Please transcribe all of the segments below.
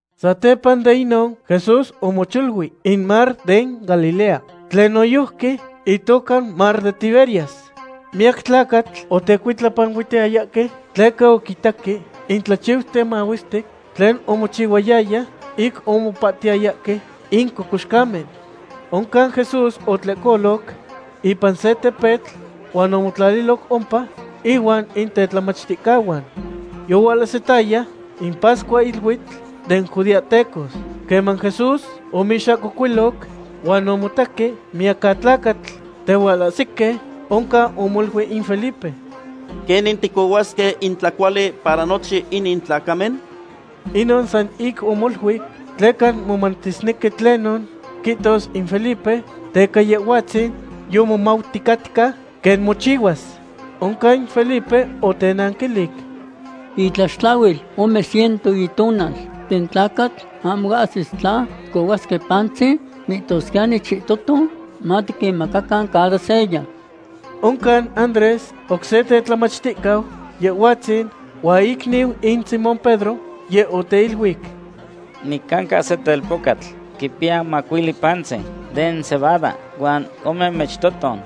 Satepa de inon, Jesús omocholui in mar den Galilea tlen noyojqui itoca mar de Tiberias. Miyacatlacatl otecuitlapanuihtayahque, tleca oquitaque in tlachiuten mahuestic tlen omochihuayaya, ic omopahtiyayahque in cocoxcamen. Oncan Jesús otlehcoloc ipan se tepetl huan omotlaliloc ompa inuan in tetlamachticahuan. Yohualahsitaya in pascuahiluitl den judeahtecos. Queman Jesús oixahcocuiloc huan omotaqui miyacatlacatl tehualahsihque, oncan omoluic in Felipe: ―¿Quenin ticohuasque in tlacuali para nochin inin tlacamen? Inon san ic omoluic, tleca momatisnequi tlenon quihtos in Felipe, tleca Yehhuatzin yomomauticatca quen mochihuas. Oncan in Felipe otenanquilic: ―Itlaxtlahuil ome ciento itonal den tlacatl ahmo ahsis tla ticohuasque pantzin, mihtosquiyani chihtoton matiquinmacacan cada seya. Oncan Andrés, oc se tetlamachticau Yehhuatzin huan icniu in Simón Pedro, yeh oteiluic: ―Nicanca se telpocatl quipiya macuili pantzin den cebada huan ome michtoton.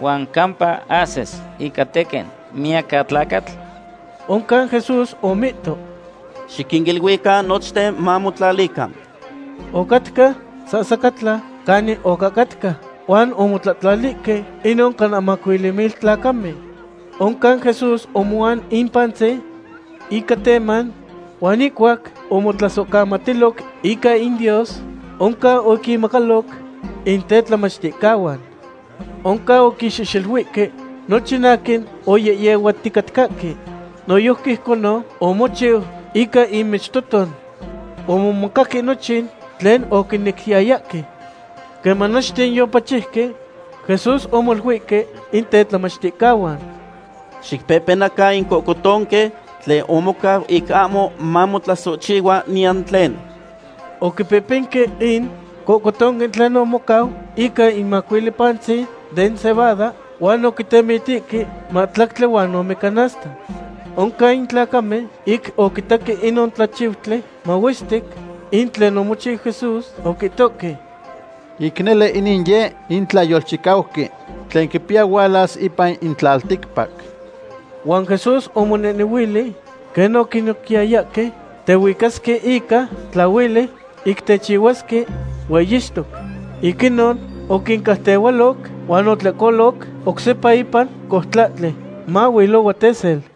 ¿Huan campa ahsis ica tequin miyacatlacatl? Oncan Jesús omihto: ―Xiquiniluican nochten mamotlalican. Ocatca sahsacatla canin ocahcatca, huan omotlahtlalihque inon cana macuili mil tlacamen. Oncan Jesús omoan in pantzin ica teman, huan ihcuac omotlasohcamatiloc ica in Dios, oncan oquinmacaloc in tetlamachticahuan. Oncan oquinxehxeluihque nochten aquin oyehyehuaticatcahque. Noyojqui ijconon omochiu ica in michtoton. Omomacaque nochin tlen oquinequiyayahque. Queman nochten yopachiuque, Jesús omoluihque in tetlamachticahuan: ―Xicpehpenacan in cohcotonque tlen omocau ic ahmo mamotlasohchihua niyan tlen. Oquipehpenque in cohcotonque tlen omocau ica in macuili pantzin den cebada huan oquitemitihque mahtlactli huan ome canasta. Oncan in tlacamen, ic oquitaque inon tlachiutli mahuestic in tlen omochiu Jesús, oquihtohque: ―Ic nele inin yeh in tlayolchicauqui tlen quipiya hualas ipan in tlalticpac. Huan Jesús omonehnehuili quen oquinequiyayahque tehuicasque ica tlahueli ic techihuasque hueyixtoc. Ic inon oquincautehualoc huan otlehcoloc oc sepa ipan coutlahtli, mailohua tesel.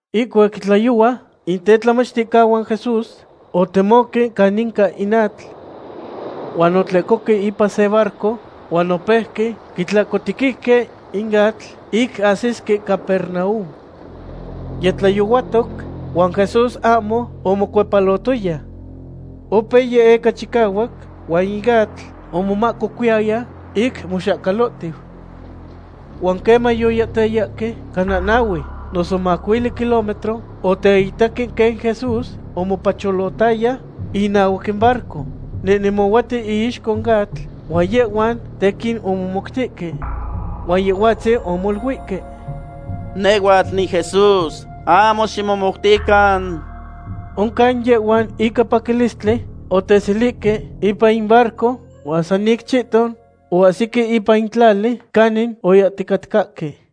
Ihcuac yitlayohua, in tetlamachticahuan Jesús otemoque caninca in atl. Huan otlehcohque ipan se barco huan opeuque quitlahcotequihque in atl ic ahsisque Capernaum. Yitlayohuatoc, huan Jesús ahmo omocuepalotoya. Opeu yehyeca chicahuac, huan in atl omahcocuiyaya ic moxahcalotiu. Huan queman yoyahtayahque cana nahue noso macuili kilómetro, oteitaque quen Jesús omopacholotaya inahuac in barco. Nehnemohuatiu iixco in atl, huan yehhuan tequin omomoutihque. Huan Yehhuatzin omoluihque: ―¡Nehhuatl niJesús, ahmo ximomoutican! Oncan yehhuan ica paquilistli oteselihque ipan in barco huan san ic chihton oahsique ipan in tlali canin oyahticatcahque.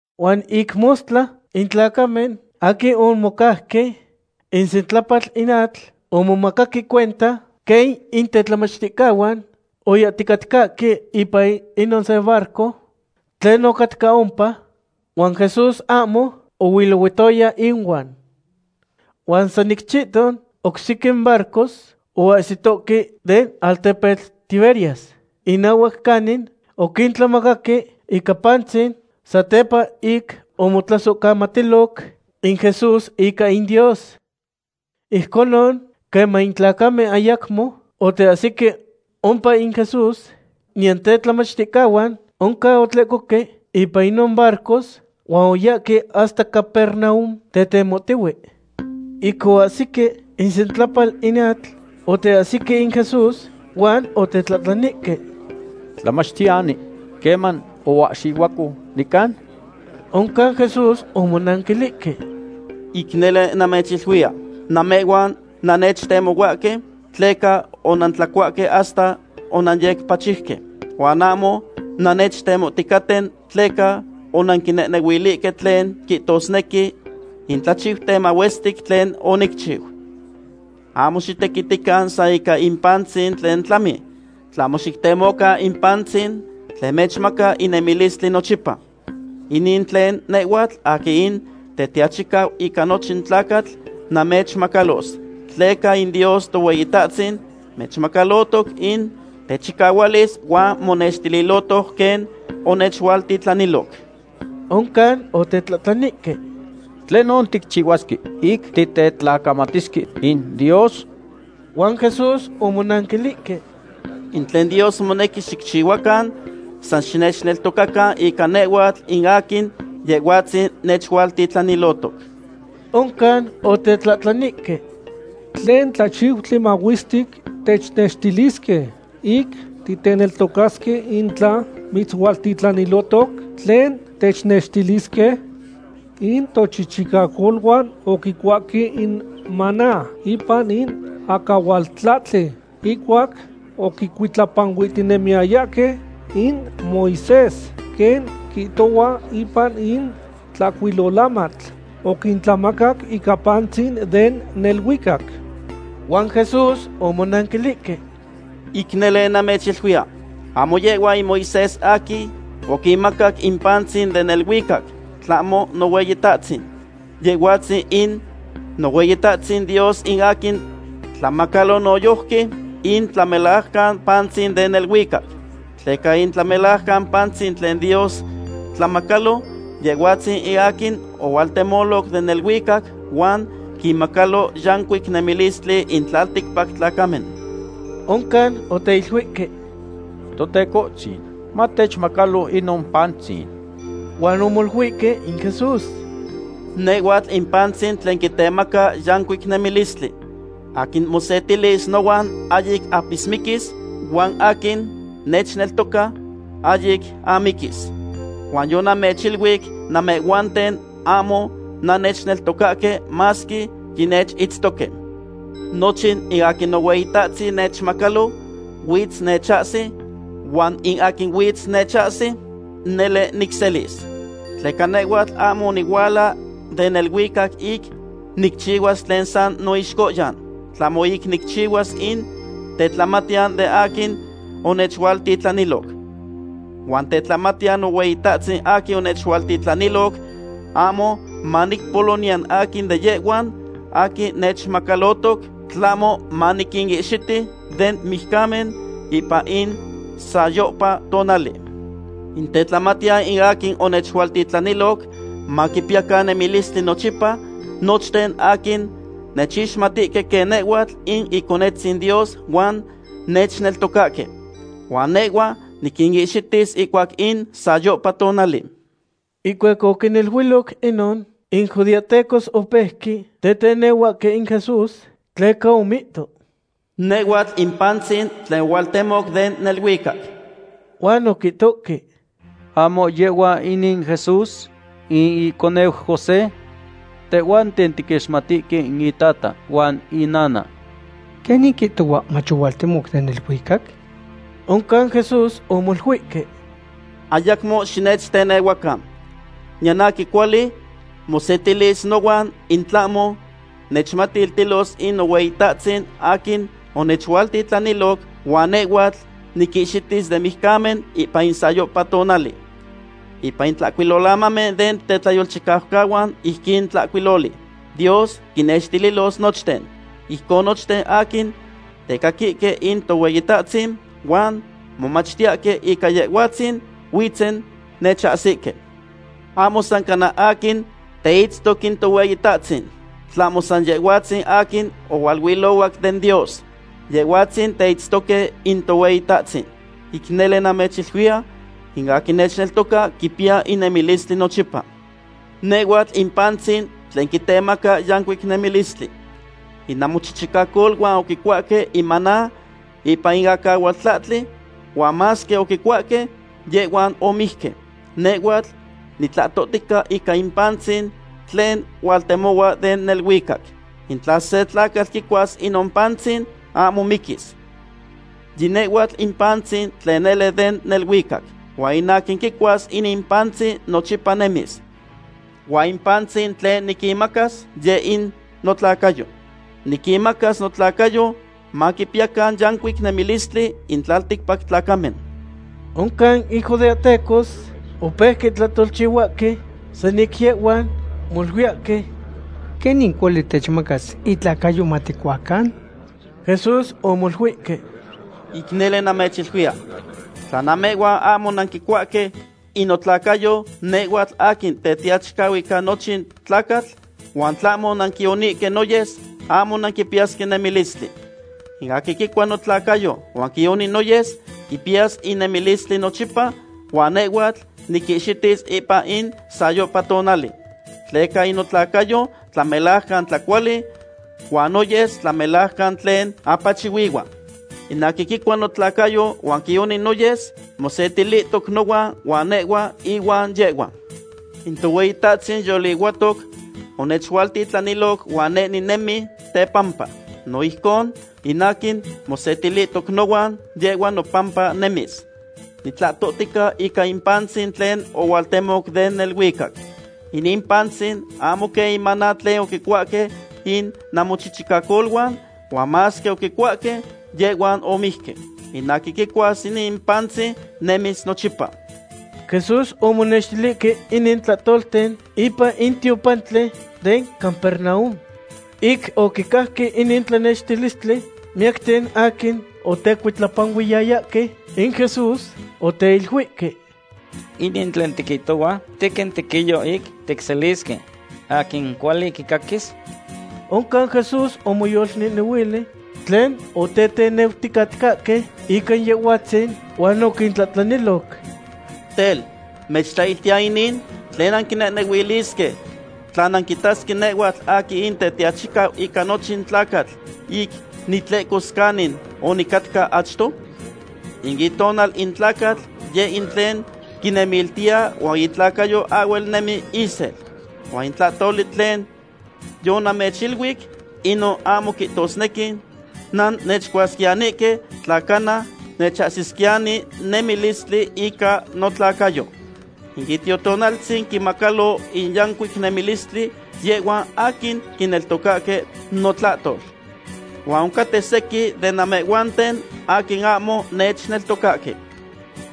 Huan ic mostla in tlacamen aquin omocauque isentlapal in atl omomacaque cuenta quen in tetlamachticahuan oyahticatcahque ipan inon se barco tlen ocatca ompa, huan Jesús ahmo ohuilohuatoya inuan. Huan san ic chihton, oc sequin barcos oahsitohque den altepetl Tiberias inahuac canin oquintlamacaque ican pantzin satepa ic omotlasohcamatiloc in Jesús ica in Dios. Ijconon, queman in tlacamen ayacmo oteahsique ompa in Jesús, niyan tetlamachticahuan, oncan otlehcohque ipan inon barcos huan oyahque hasta Capernaum tetemohtihue. Ic oahsique isentlapal in atl, oteahsique in Jesús huan otetlahtlanihque: ―Tlamachtiyani, ¿queman oahxihuaco nican? Oncan Jesús omonanquilihque: ―Ic nele namechiluia, namehhuan nannechtemohuahque tleca onantlacuahque hasta onanyecpachiuque. Huan ahmo nannechtemohticaten tleca onanquinehnehuilihque tlen quihtosnequi in tlachiuten mahuestic tlen onicchiu. Ahmo xitequitican san ica in pantzin tlen tlami, tlahmo xictemocan in pantzin tlen mechmaca in nemilistli nochipa. Inin tlen nehhuatl aquin in Tetiachicau ica nochin tlacatl namechmacalos, tleca in Dios Tohueyitahtzin nechmacalotoc in techicahualis huan monextililotoc quen onechualtitlaniloc. Oncan otetlahtlanihque: ―¿Tlenon ticchihuasque ic titetlacamatisque in Dios? Huan Jesús omonanquilihque: ―In tlen Dios monequi xicchihuacan, san xinechneltocacan ica nehhuatl in aquin Yehhuatzin nechualtitlaniloc. Oncan otetlahtlanihque: ―¿Tlen tlachiutli mahuestic technextilisque, ic ticneltocasque in tla mitzualtitlanilotoc? ¿Tlen technextilisque? In tochichicacoluan oquicuahque in maná ipan in acahualtlahtli ihcuac oquicuitlapanuihtinemiyayahque in Moisés, quen quihtohua ipan in Tlahcuilolamatl: “Oquintlamaca in pantzin den neluicac.” Huan Jesús omonanquilihque: ―Ic nele namechiluiya, ahmo yehhua in Moisés aquin oquinmacac in pantzin den neluicac, tlahmo Nohueyitahtzin. Yehhuatzin in Nohueyitahtzin Dios in aquin tlamacalo noyojqui in tlamelajcan pantzin den neluicac. Tleca in tlamelajcan pantzin tlen Dios tlamacalo, Yehhuatzin in aquin ohualtemoloc den neluicac huan quinmacalo yancuic nemilistli in tlalticpac tlacamen. Oncan oteiluihque: ―Totecohtzin, matechmacalo inon pantzin. Huan omoluihque in Jesús: ―Nehhuatl in pantzin tlen quitemaca yancuic nemilistli. Aquin mosetilis nohuan ahyic apismiquis, huan aquin nechneltoca, ahyic amiquis. Huan yonamechiluic namehhuanten ahmo nannechneltocahque masque yinechitztoque. Nochin in aquin Nohueyitahtzin nechmacalo, huitz nechahsi, huan in aquin huitz nechahsi, nele nicselis. Tleca nehhuatl ahmo onihuala den neluicac ic nicchihuas tlen san noixcohyan, tlahmo ic nicchihuas in tetlamatiyan den aquin onechualtitlaniloc. Huan tetlamatiyan Nohueyitahtzin aquin onechualtitlaniloc ahmo maniquimpolo niyan aquin de yehhuan aquin nechmacalotoc, tlahmo maniquinihxiti den mijcamen ipan in sayohpa tonali. In tetlamatiyan in aquin onechualtitlaniloc maquipiyacan nemilistli nochipa nochten aquin nechixmatihque quen nehhuatl in Iconetzin Dios huan nechneltocahque. Huan nehhua niquinihxitis ihcuac in sayohpa tonali. Ihcuac oquiniluiloc inon, in judeahtecos opeuque tetenahuahque in Jesús, tleca omihto: “Nehhuatl in pantzin tlen ohualtemoc den neluicac.” Huan oquihtohque: ―¿Ahmo yehhua inin Jesús, in iconeu José? Tehhuanten tiquixmatihque in itata huan inana. ¿Quenin quihtohua mach ohualtemoc den neluicac? Oncan Jesús omoluihque: ―Ayacmo xinechtenehuacan. Niyan aquin cuali mosetilis nohuan, in tlahmo nechmatiltilos in Nohueyitahtzin aquin onechualtitlaniloc, huan nehhuatl niquihxitis den mijcamen ipan in sayohpa tonali. Ipan in Tlahcuilolamamen den tetlayolchicaucahuan ijquin tlahcuiloli: “Dios quinnextililos nochten.” Ijcon nochten aquin tecaquihque in Tohueyitahtzin, huan momachtiyahque ica Yehhuatzin, huitzen nechahsique. ’Ahmo san cana aquin teitztoc in Tohueyitahtzin, tlahmo san Yehhuatzin aquin ohualuilohuac den Dios. Yehhuatzin teitztoque in Tohueyitahtzin. Ic nele namechiluiya, in aquin nechneltoca quipiya in nemilistli nochipa. Nehhuatl in pantzin tlen quitemaca yancuic nemilistli. In namochichicacoluan oquicuahque in maná ipan in acahualtlahtli, huan masque oquicuahque, yehhuan omijque. Nehhuatl nitlahtohtica ica in pantzin tlen hualtemohua den neluicac. In tla se tlacatl quicuas inon pantzin, ahmo miquis. Yi nehhuatl in pantzin tlen nele den neluicac, huan in aquin quicuas inin pantzin nochipa nemis. Huan in pantzin tlen niquinmacas, yeh in notlacayo. Niquinmacas notlacayo maquipiyacan yancuic nemilistli in tlalticpac tlacamen. Oncan in judeahtecos opeuque tlahtolchihuahque san ic yehhuan, moluiyahque: ―¿Quenin cuali techmacas itlacayo maticuacan? Jesús omoluihque: ―Ic nele namechiluiya, tla namehhuan ahmo nanquicuahque in notlacayo nehhuatl aquin Tetiachicau ica nochin tlacatl, huan tlahmo nanquionihque noyes, ahmo nanquipiyasque nemilistli. In aquin quicua notlacayo huan quioni noyes quipiyas in nemilistli nochipa, huan nehhuatl niquihxitis ipan in sayohpa tonali. Tleca in notlacayo tlamelajcan tlacuali, huan noyes tlamelajcan tlen apachihuihua. In aquin quicua notlacayo huan quioni noyes mosetilihtoc nohuan huan nehhua ihuan yehhua. In Tohueyitahtzin yolihuatoc onechualtitlaniloc huan neh ninemi tepampa. No ijcon, in aquin mosetilihtoc nohuan, yehhua nopampa nemis. Nitlahtohtica ica in pantzin tlen ohualtemoc den neluicac. Inin pantzin ahmo quen in maná tlen oquicuahque in namochichicacoluan, huan masque oquicuahque, yehhuan omijque. In aquin quicuas inin pantzin, nemis nochipa. Jesús omonextilihque inin tlatolten ipan in tiopantli den Capernaum. Ic oquicajque inin tlanextilistli, miyacten aquin otecuitlapanuiyayahque in Jesús oteiluihque: ―Inin tlen tiquihtohua tequin tequiyo ic ticselisque. ¿Aquin cuali quicaquis? Oncan Jesús omoyolnehnehuili tlen oteteneuticatcahque ica Yehhuatzin, huan oquintlahtlaniloc. ―Tel, ¿mechtlahiltiya inin? ¿Tlen nanquinehnehuilisque tla nanquitasque nehhuatl aquin in Tetiachicau ica nochin tlacatl ic nitlehcos canin onicatca achto? In itonal in tlacatl yeh in tlen quinemiltiya huan itlacayo ahhuel nemi isel. Huan in tlahtoli tlen yonamechiluic, inon ahmo quihtosnequi nannechcuasquiyanihque tla cana mechahsisquiyani nemilistli ica notlacayo. In Itiotonaltzin quinmacalo in yancuic nemilistli yehhuan aquin quineltocahque notlahtol. Huan oncaten sequin den namehhuanten aquin ahmo nechneltocahque.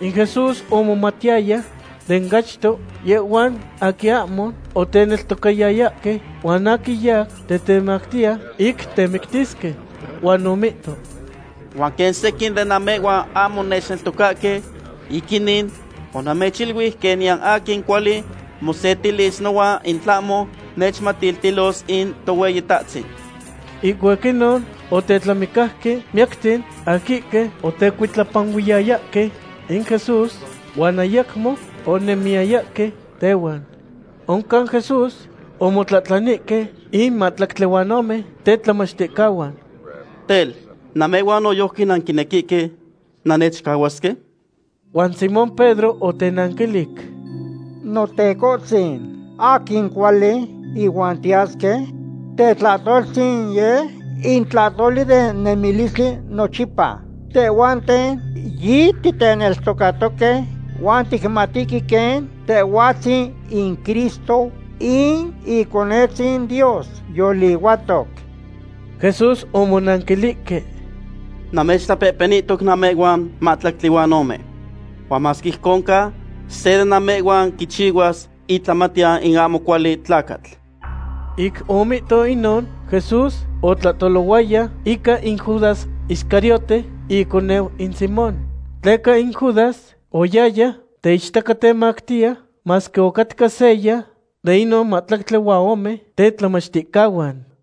In Jesús omomatiyaya den achto yehhuan aquin ahmo oteneltocayayahque, huan aquin yau tetemactiya ic temictisque. Huan omihto: ―Huan quen sequin de namehhuan ahmo nechneltocahque, ic inin onamechiluic quen niyan aquin cuali mosetilis nohuan in tlahmo nechmatiltilos in Tohueyitahtzin. Ihcuac inon otetlamicauque miyacten aquihque otecuitlapanuiyayahque in Jesús, huan ayacmo onemiyayahque tehuan. Oncan Jesús omotlahtlanihque in mahtlactli huan ome tetlamachticahuan: ―Tel, ¿namehhuan noyojqui nanquinequihque nannechcahuasque? Huan Simón Pedro otenanquilic: ―Notecohtzin, ¿aquin cuali ihuan tiyasque? Tetlahtoltzin yeh in tlahtoli den nemilistli nochipa. Tehhuanten yititeneltocatoque, huan ticmatihque quen Tehhuatzin in Cristo, in Iconetzin Dios yolihuatoc. Jesús omonanquilihque: ―Namechtlapehpenihto namehhuan mahtlactli huan ome. Huan masque ijcon ca, se den namehhuan quichihuas itlamatiyan in ahmo cuali tlacatl. Ic omihto inon, Jesús otlahtolohuaya ica in Judas Iscariote, iconeu in Simón. Tleca in Judas oyaya teichtacatemactiya, masque ocatca seya den inon mahtlactli huan ome tetlamachticahuan.